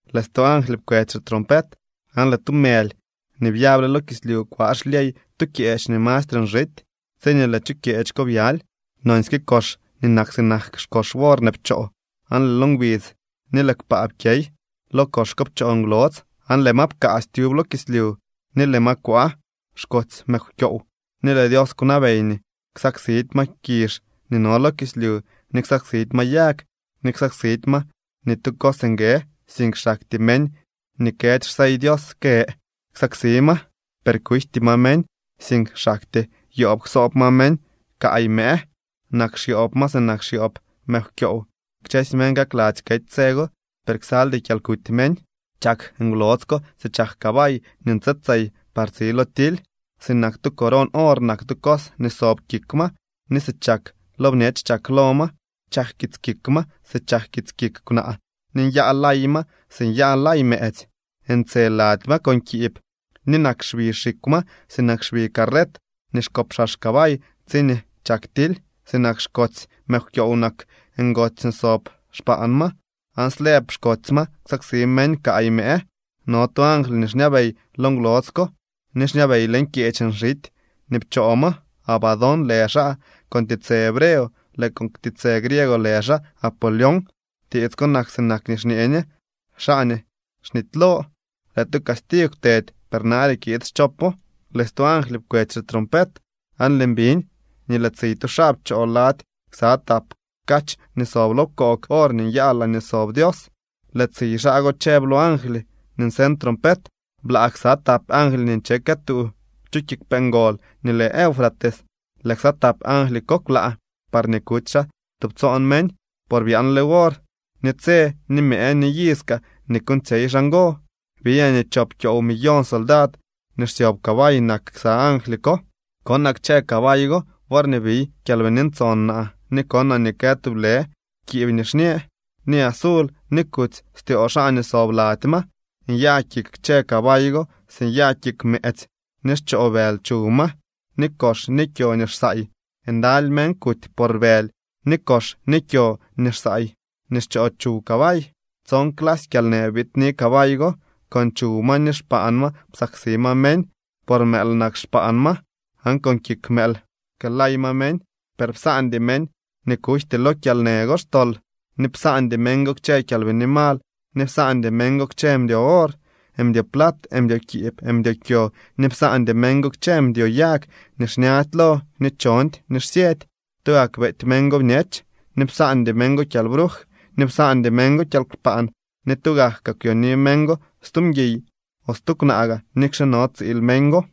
Lëë stu angly pkwetsy xitrompet, aan lëë tu mëly nii byable lo kislyu kwaa xlyey tu kyeech nii mastre nxity. Tsiñee lëë chu kyeech ko byaly, nonsyke kox nii nak sinak xkox worne pchoo, aan lëë lo ngbidz ni lëë kpaa pkyey. Lo kox ko pchoo ngwlodz aan lëë ma pkaasy tyub lo kislyu, ni lëë ma kwaa xkotsy mëkwkyoow. Ni lëë Dios kwnabey nii ksaksidy ma kizh nii no lo kislyu, ni ksaksidy ma yag, ni ksaksidy ma ni tu cos nguë, sink xaktyee meñ nii këdy xsey Dios kë ksaksi ma. Per kujty ma meñ, sink xaktyee yoob ksoob ma meñ kaay mëë. Nak xyoob ma sinak xyoob mëkwkyoow. Kchësy meñ kakladzy kety tse go, per ksaldy kyalkuty meñ. Chak ngwlodz ko si chak cabay nii nche tsey par tsi lo tily, sinak tu coron or nak tu cos nii sob kik ma ni si chak lo bñech chak lo ma. Chak kits kik ma si chak kits kik kwnaa, ni nyaa lay ma si nyaa lay mëëtsy. Ntse lady ma con kiib, ni nak xbi xikw ma sinak xbi carret nii xkopxax cabay tsiñee chak tily. Sinak xkotsy mëkwkyoow nak ngotsy nii sob xpaan ma. Aan slëb xkotsy ma ksaksi meñ kaay mëë. No tu angly nii xñabey lo ngwlodz ko ni xñabey leñ kyeech nxity nii pchoo ma. Abadón lë xaa con tiitsë hebreo, lëë con tiitsë griego lë xaa Apolión. (Tiits ko nak sinak nii xñee ñe: Xaa nii xnitylo.) Lëë tu castigw kwtedy, per nare kiid schopo. Lëë stu angly pkwetsy xitrompet, aan lëën biñ nii lëë tsiy tu xaa pchoo lady ksa tap kach nii sob lo pkoog or nii nyaa laañee sob Dios. Lëë tsiy xaa go chëb lo angly nii nseñ trompet: —Blaa ksa tap angly nii nche këtuu chu kiigwpee ngol nii lë Eufrates. Lëë ksa tap angly ko kwlaa parñee kuty xaa tubtsoon meñ, por byaanle wor, ni tse, ni mëë, ni iz kaa nii kuuñtsyey xaa ngo. Biñaa nii chop kyoow millón soldad nii xsyob cabay nak ksa angly ko. Konaa kchë cabay go worñee biy Kyalbini Ntson naa ni konaa nii kë tublë kiib nixñë, ni azul ni kutsy styoo xaa nii sob lady ma. Nyaa kik kchë cabay go si nyaa kik mëëtsy, ni xchoo bëly chuw ma ni kox ni kyo nii xsaay. Ndaly meñ kuty por bëly ni kox ni kyo nii xsaay nii xchoo chuw cabay. Tson clasy kyalnë biidni cabay go. Con chuw ma ni xpaan ma psaksi ma meñ, por mëël nak xpaan ma aan con kik mëël pkëëlay ma meñ. Per psaandy meñ nii kujty lo kyalnë go xtol, ni psaandy meñ go kchë kyalbini mal ni psaandy meñ go kchë mdyo or, mdyo plat, mdyo kiib, mdyo kyo ni psaandy meñ go kchë mdyo yag nii xñady lo, ni chondy ni xsyëdy. Tugak beety meñ go bñech, ni psaandy meñ go kyalbruj, ni psaandy meñ go kyalkpaan ni tugak kaa kwyooni meñ go stu mguiy o stu kwnaa gaa nikxe no tsiil meñ go.